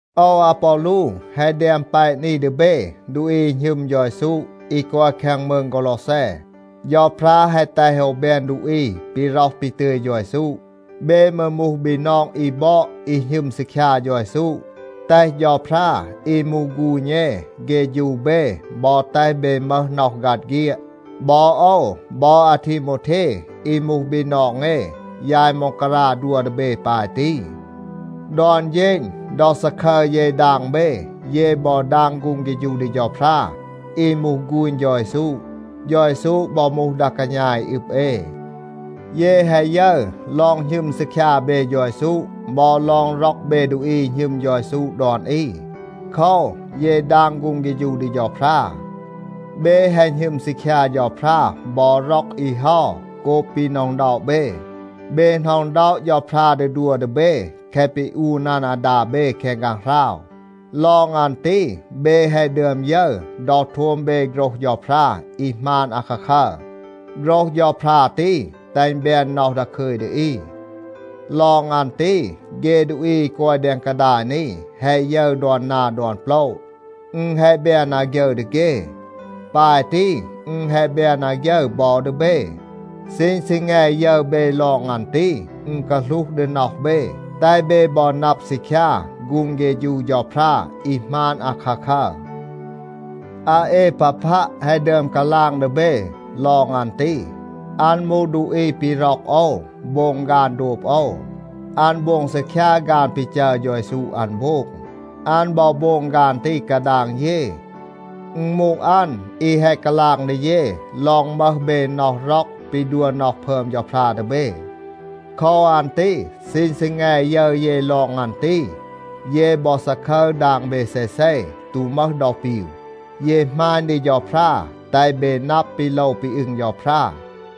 โอว อาปอลู แฮะ แดม แปะ นี ดี เบ ดูอี อี หณึม เฌา เยซู อี กอย แคง มืง กอลอแซ. เฌาพรา แฮะ แตห โอว แบน ดูอี ปี ร็อห ปี ตึย เฌา เยซู. เบ มืร มูห บีนอง อี บอด, อี หณึม ซีคยา เฌา เยซู. แตห เฌาพรา อี มูห ฆูณ เอ เฆฌู เบ บอ แตห เบ มึห น็อห ฆัด เฆียด. บอ โอว บอ อาทีโมวเท อี มูห บีนอง เอ, ยาย ม็องการา ดัว ดี เบ ปาย ตี. ดอน เฌณ ดอ ซาคึร เย ดาง เบ, เย บอ ดาง ฆูง เฆฌู ดี เฌาพรา อี มูห ฆูณ เฌา เยซู. เฌา เยซู บอ มูห ดา กาณา อี อึบ เอ. เย แฮะ ยึร ลอง หณึม ซีคยา เบ เฌา เยซู บอ ลอง ร็อก เบ ดูอี อี หณึม เฌา เยซู ดอน อี. โคว, เย ดาง ฆูง เฆฌู ดี เฌาพรา. เบ แฮะ หณึม ซีคยา เฌาพรา บอ ร็อก อี เฮา โกบ ปี หน็อะ อึณด็อะ เบ. เบ หน็อะ อึณด็อะ เฌาพรา ดี ดัว ดี เบ แคะ ปี อูน อัน อาดา เบ แคง ฆางหราว. ลอง อัน ตี, เบ แฮะ ดึอม ยึร ดอ โทม เบ โฆรห เฌาพรา อี หมาน อาคาคัร. โฆรห เฌาพรา ตี แตห อึณ แบน น็อห ดาคึย ดี อี. ลอง อัน ตี, เฆ ดูอี อี กอย แดง กาดาย นี แฮะ ยึร ดอน นา ดอน โปละ. อึณ แฮะ แบน อาฆยึร ดี เฆ. ปาย ตี อึณ แฮะ แบน อาฆยึร บอ ดี เบ. ซีณ ซีแง ยึร เบ ลอง อัน ตี, อึณ กาหลูห ดี น็อห เบ, แตห เบ บอ นับ ซีคยา ฆูง เฆฌู เฌาพรา อี หมาน อาคาคัร. อาเอปาพัะ แฮะ ดึอม กาลาง ดี เบ ลอง อัน ตี. อัน มูห ดูอี ปี ร็อก โอว, โบง ฆาน โดบ โอว. อัน โบง ซีคยา ฆาน ปี จัร เฌา เยซู อัน โบง. อัน บอ โบง ฆาน ตี กาดาง เย. อึณ มูห อัน อี แฮะ กาลาง ดี เย ลอง มึห เบ น็อห ร็อก ปี ดัว น็อห พึอม เฌาพรา ดี เบ. โคว อัน ตี ซีณ ซีแง ยึร เย ลอง อัน ตี, เย บอ ซาคึร ดาง เบ เซเซ, ตู มึห ดอ ปีว. เย หมาณ ดี เฌาพรา, แตห เบ นับ ปี โลว ปี อึง เฌาพรา,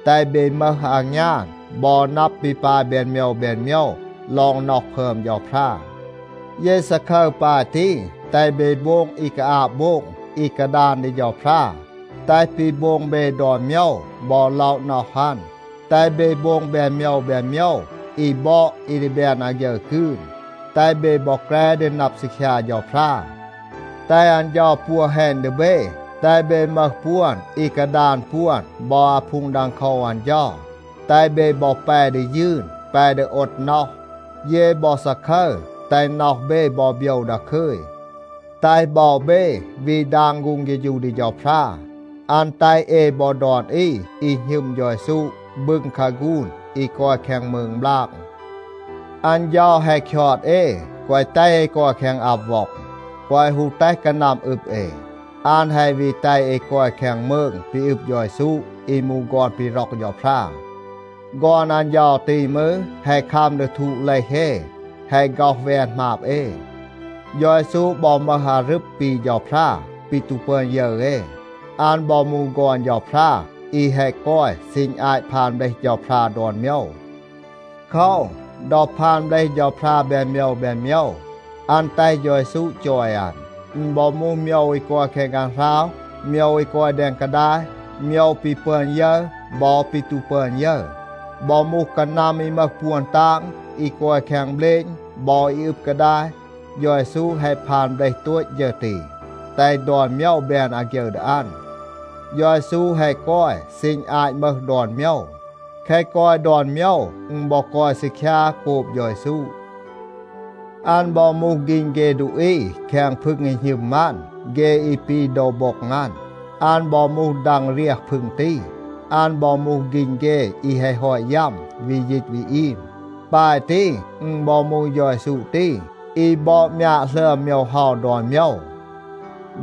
แตห เบ มึห อางยาน บอ นับ ปี ปาย แบน โมยว แบน โมยว ลอง น็อห พึอม เฌาพรา. เย ซาคึร ปาย ตี, แตห เบ โบง อี กาอาบ โบง, อี กาดาน ดี เฌาพรา, แตห ปี โบง เบ ดอน โมยว บอ ล็อะ น็อห อัน. แตห เบ โบง แบน โมยว แบน โมยว อี บอด อี ดี แบน อาฆยึร กืน. แตห เบ บอ แกร ดี นับ ซีคยา เฌาพรา. แตห อัน เฌา ปัว แฮณ ดี เบ, แตห เบ มึห ปวน อี กาดาน ปวน บอ อาพูง ดังโคว อัน เฌา, แตห เบ บอ แป ดี ยืน, แป ดี โอด น็อห. เย บอ ซาคึร, แตห น็อห เบ บอ โบยว ดาคึย. แตห บอ เบ วี ดาง ฆูง เฆฌู ดี เฌาพรา. อัน แตห เอ บอ ดอน อี อี หณึม เฌา เยซู บึง คาฆูน อี กอย แคง มืง บลาง. อัน เฌา แฮะ คยอด เอ, แกวะ แตห เอ กอย แคง อับ ว็อง. แกวะ ฮู แตห กานัม อึบ เอ. อัน แฮะ วี แตห เอ กอย แคง มืง ปี อึบ เฌา เยซู อี มูห ฆอน ปี ร็อก เฌาพรา. ฆอน อัน เฌา ตี มืร, แฮะ คัม ดี ทูด เลห เอ, แฮะ ฆ็อห แวน หมาบ เอ. เฌา เยซู บอ มึห อารึบ ปี เฌาพรา, ปี ตู ปึอน ยึร เอ. อัน บอ มูห ฆอน เฌาพรา อี แฮะ กอย ซีณ อาต พาน เบลห เฌาพรา ดอน โมยว. โคว, ดอ พาน เบลห เฌาพรา แบน โมยว แบน โมยว, อัน แตห เฌา เยซู จอย อัน. อึณ บอ มูห โมยว อี กอย แคง ฆางหราว, โมยว อี กอย แดง กาดาย, โมยว ปี ปึอน ยึร บอ ปี ตู ปึอน ยึร, บอ มูห กานัม อี มึห ปวน ตาง, อี กอย แคง เบลณ บอ อี อึบ กาดาย, เฌา เยซู แฮะ พาน เบลห โตต ฌึร ตี, แตห ดอน โมยว แบน อาฆยึร ดี อัน. เฌา เยซู แฮะ กอย ซีณ อาต มึห ดอน โมยว. แคะ กอย ดอน โมยว, อึณ บอ กอย ซีคยา โกบ เฌา เยซู. อัน บอ มูห ฆีณ เฆ ดูอี แคง พึง อี หณึม อัน, เฆ อี ปี โดว โบ็ง อัน. อัน บอ มูห ดัง เรียห พึง ตี. อัน บอ มูห ฆีณ เฆ อี แฮะ ฮอต ยัม, วี ยีต วี อีม. ปาย ตี, อึณ บอ มูห เฌา เยซู ตี, อี บอด มยาด หลึอม โมยว เฮา ดอน โมยว.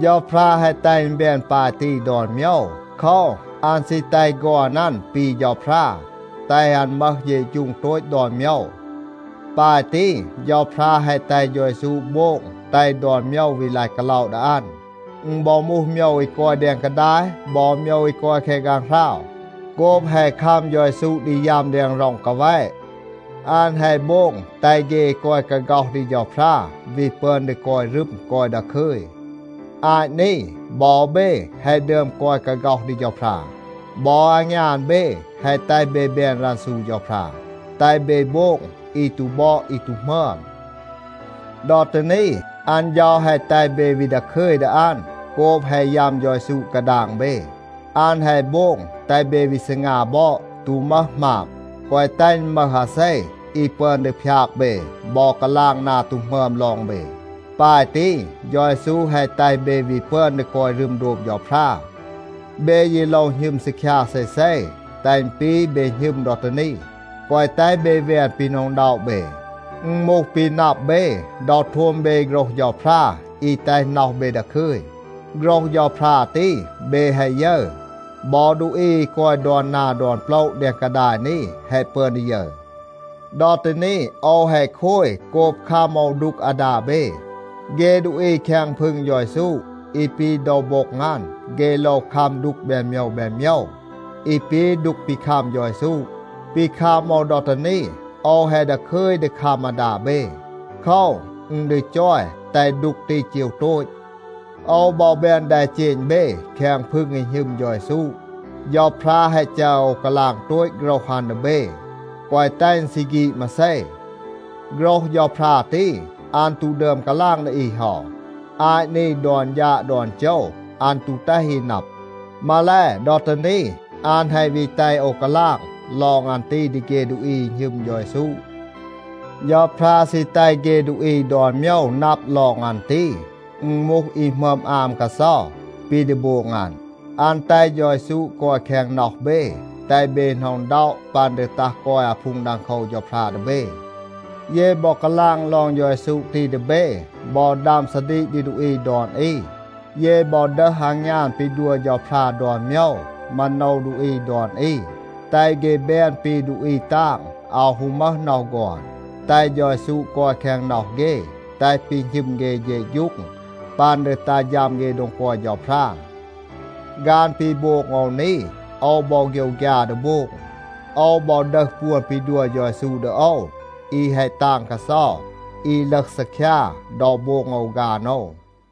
เฌาพรา แฮะ แตห อึณ แบน ปาย ตี ดอน โมยว. โคว, อัน ซี แตห ฆอน อัน ปี เฌาพรา, แตห อัน มึห เฌะฌูง โตต ดอน โมยว. ปาย ตี, เฌาพรา แฮะ แตห เฌา เยซู โบง แตห ดอน โมยว วี ลาย กาล็อะ ดี อัน. อึณ บอ มูห โมยว อี กอย แดง กาดาย บอ โมยว อี กอย แคง ฆางหราว. โกบ แฮะ คัม เฌา เยซู ดี ยัม แดง ร็อง กาแวะ, อัน แฮะ โบง แตห เฆ อี กอย กาฆ็อห ดี เฌาพรา วี ปึอน ดี กอย รึม, กอย ดาคึย. อาต นี บอ เบ แฮะ ดึอม กอย กาฆ็อห ดี เฌาพรา. บอ อางยาน เบ แฮะ แตห เบ แบน รันซู เฌาพรา, แตห เบ โบง อี ตู บอด อี ตู หมึอม. ดอ ตี นี, อัน เฌา แฮะ แตห เบ วี ดาคึย ดี อัน โกบ แฮะ ยัม เฌา เยซู กาดาง เบ. อัน แฮะ โบง แตห เบ วี ซีงา บอด, ตู มึห หมาบ, แกวะ แตห อึณ มึห อาเซ อี ปึอน ดี พยาก เบ บอ กาลาง นา ตู หมึอม ลอง เบ. ปาย ตี เฌา เยซู แฮะ แตห เบ วี ปึอน ดี กอย รึม โดบ เฌาพรา. เบ ยี โลว หณึม ซีคยา เซเซ, แตห อึณ ปี เบ หณึม ดอ ตี นี. แกวะ แตห เบ แวน ปี หน็อะ อึณด็อะ เบ. อึณ มูห ปี นับ เบ ดอ โทม เบ โฆรห เฌาพรา อี แตห น็อห เบ ดาคึย. โฆรห เฌาพรา ตี, เบ แฮะ ยึร. บอ ดูอี อี กอย ดอน นา ดอน โปละ แดง กาดาย นี แฮะ ปึอน ดี ยึร. ดอ ตี นี โอว แฮะ โคย โกบ คัม โอว ดูก อาดา เบ. เฆ ดูอี แคง พึง เฌา เยซู, อี ปี โดว โบ็ง อัน, เฆ โลว คัม ดูก แบน โมยว แบน โมยว, อี ปี ดูก ปี คัม เฌา เยซู. ปี คัม โอว ดอ ตี นี, โอว แฮะ ดาคึย ดี คัม อาดา เบ. โคว, อึณ ดี จอย แตห ดูก ตี เจว โตต. โอว บอ แบน แดเจณ เบ แคง พึง อี หณึม เฌา เยซู. เฌาพรา แฮะ จัร โอว กาลาง โตต โฆรห อัน ดี เบ, แกวะ แตห อึณ ซี ฆีด มาเซ. โฆรห เฌาพรา ตี, อัน ตู ดึอม กาลาง ดี อี เฮา. อาต นี ดอน ฌาด ดอน โจว อัน ตู แตห อี นับ. มาแล, ดอ ตี นี, อัน แฮะ วี แตห โอว กาลาง ลอง อัน ตี ดี เฆ ดูอี อี หณึม เฌา เยซู. เฌาพรา ซี แตห เฆ ดูอี ดอน โมยว นับ ลอง อัน ตี. อึณ มูห อี หมึอม อาม กาเซา, ปี ดี โบง อัน. อัน แตห เฌา เยซู กอย แคง น็อห เบ, แตห เบ หน็อะ อึณด็อะ ปัน ดี ตัห กอย อาพูง ดังโคว เฌาพรา ดี เบ. เย บอ กาลาง ลอง เฌา เยซู ตี ดี เบ, บอ ดัม ซาดีก ดี ดูอี ดอน อี. เย บอ ดึห อางยาน ปี ดัว เฌาพรา ดอน โมยว, มาโนว ดูอี ดอน อี, แตห เฆ แบน ปี ดูอี ตาง, อาว ฮู มึห น็อห ฆอน, แตห เฌา เยซู กอย แคง น็อห เฆ, แตห ปี หณึม เฆ เฌะฌูง ปัน ดี ตัห ฌัม เฆ โดง กอย เฌาพรา. ฆาน ปี โบง โอว นี, โอว บอ โฆยวฆยา ดี โบง. โอว บอ ดึห ปวน ปี ดัว เฌา เยซู ดี โอว, อี แฮะ ตาง กาเซา, อี ลึห ซีคยา ดอ โบง โอว ฆาน โอว.